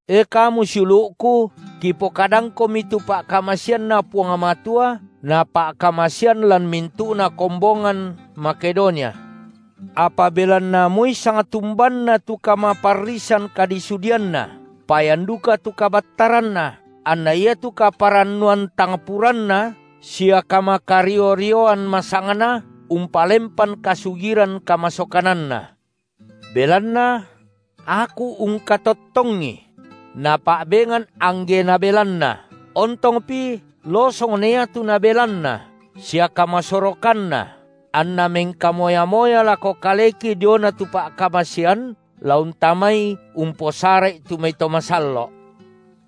E kamu siulu’ku, kipokadangkomi tu pa’kamaseanNa Puang Matua Napa’kamasean lan mintu’na kombongan Makedonia. Apa belanna moi sangtumbanna tu kamaparrisan kadisudianna, payan duka tu kabattaranna, anna iatu kaparannuan tang puranna sia kamakario-rioan masangna umpalempan kasugiran kamasokananna. Belanna – aku ungkatottongi – napa’bengan angge nabelanna, ontongpi losong na iatu nabelanna, sia kamasorokanna anna mengkamoya-moya lako kaleki diona tu pa’kamasean la untamai umposara’i tu mai to masallo’.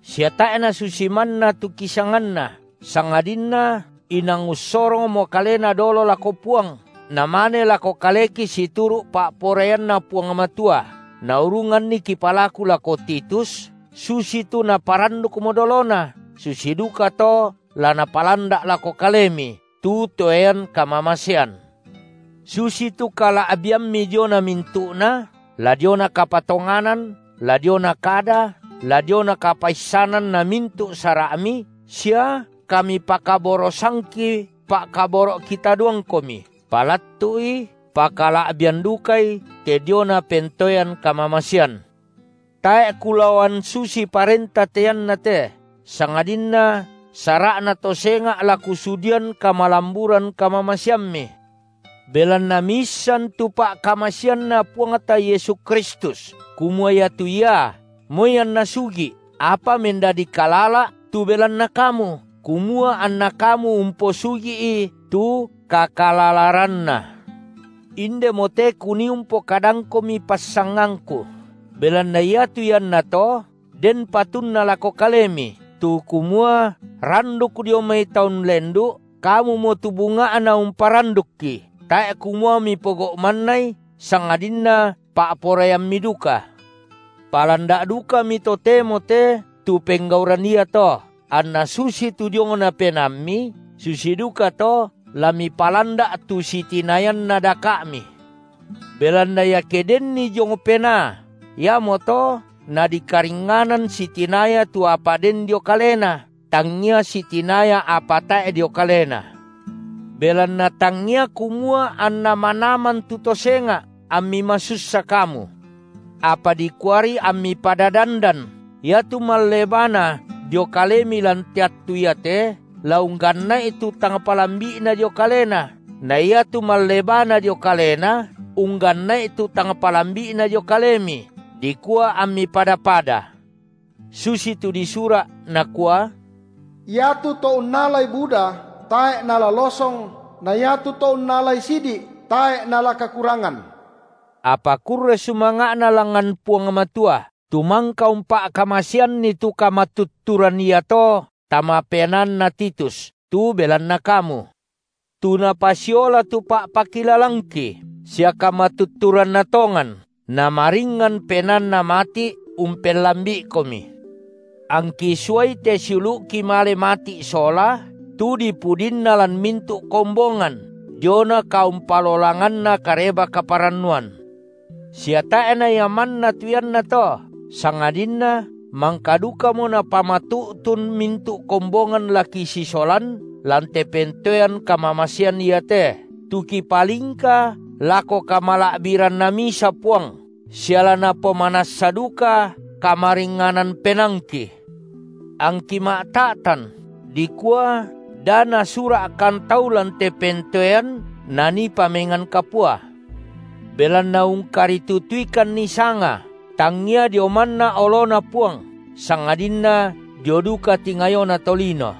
Sia tae’ nasusi manna tu kisanganna, sangadinna inang ussorongmo kalena dolo lako Puang, namane lako kaleki situru’ pa’poraianNa Puang Matua, naurunganni kipalaku lako Titus, susitu naparandukmo dolona, susi dukato la napalanda’ lako kalemi tu toean kamamasean. Susitu kala’biammi diona mintu’na, la diona kapatonganan, la diona kada, la diona kapaissanan na mintu’ sara’mi sia kamipakaborosangki pa’kaboro’ kitadoangkomi, palattu’i pakala’bian dukai te diona pentoean kamamasean. Tae’ kulaoan susii parenta te iannate, sangadinna sara’na to senga’ la kusudian kamalamburan kamamaseammi. Belanna miissan tu pa’kamaseanNa Puangta Yesu (Kristus) kumua iatu Ia, moi anNa sugi’, apa mendadi kalala’ tu belanna kamu, kumua anna kamu umposugi’i tu kakalalaranNa. Indemote kunii umpokadangkomi passangangku. Belanna iatu iannato den patunna lako kalemi, tu kumua randuk dio mai taun lendu’, kamumo tu bunga’na umparandukki, tae’ kumua mipogau’ mannai, sangadinna pa’poraiammi duka. Palanda’ dukami totemo te tu penggauran iato, anna susitu diongna penaammi, susi dukato la mipalanda’ tu sitinayanna daka’mi. Belanna iake denni diong penaa iamoto nadikaringnganan sitinaya tu apa den dio kalena, tangia sitinaya apa tae’ dio kalena. Belanna tangia kumua anna manaman tu to senga’ ammi masussa kamu. Apa dikuari ammi pada dandan, iatu mallebana dio kalemi lan te attu iate, la ungganna’i tu tang palambi’na dio kalena, na iatu mallebana dio kalena ungganna’i tu tang palambi’na dio kalemi, dikua ammi pada-pada. Susitu disura’, nakua: Iatu to unnalai buda tae’ nala losong, na iatu to unnalai sidi’, tae’ nala kakurangan. Apa kurre sumanga’na langngan Puang Matua, tu mangka umpa’kamaseanni tu kamatutturan iato tama penaanna Titus tu belanna kamu. Tu napasiola tu pa’pakilalangki, sia kamatutturanna tongan namaringngan penaanna mati’ umpellambi’ikomi. Angki suai te siulu’ki male mati’ sola, tu dipudinna lan mintu’ kombongan diona kaumpalolanganna Kareba-kaparannuan. Sia tae’ na ia manna tu iannato, sangadinna mangka dukamo napamatu’tun mintu’ kombongan la kisisolan lan te pentoean kamamasean iate, tu kipalingka lako kamala’biranNa misa Puang sia la napomanassa duka kamaringnganan penaangki. Angki ma’ta’tan dikua da na sura’- kan tau lan te pentoean nanii pame- ngan kapua. Belanna ungkaritutuikanni sanga, tangia dio manna oloNa Puang, sangadinna dio duka tingayona tolino.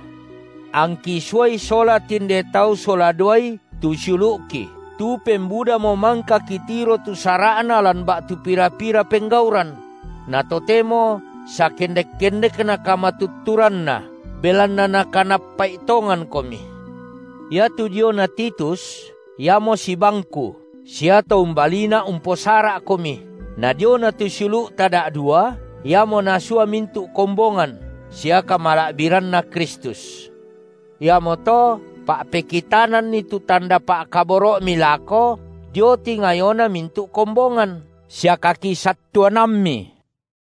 Angki suai sola tinde tau sola duai tu siulu’ki, tu pembudamo mangka kitiro tu sara’na lan ba’tu pira-pira penggauran; na totemo sakendek-kendekna kamatutturanna, belanna nakanappa’i tongankomi. Iatu diona Titus, iamo sibangku sia to umbaliina’ umposara’komi, na diona tu siulu’ta da’dua, iamo nasua mintu’ kombongan sia kamala’biranNa Kristus. Iamoto pa’pekitananni tu tanda pa’kaboro’mi lako dio tingayona mintu’ kombongan, sia kakisattuanammi.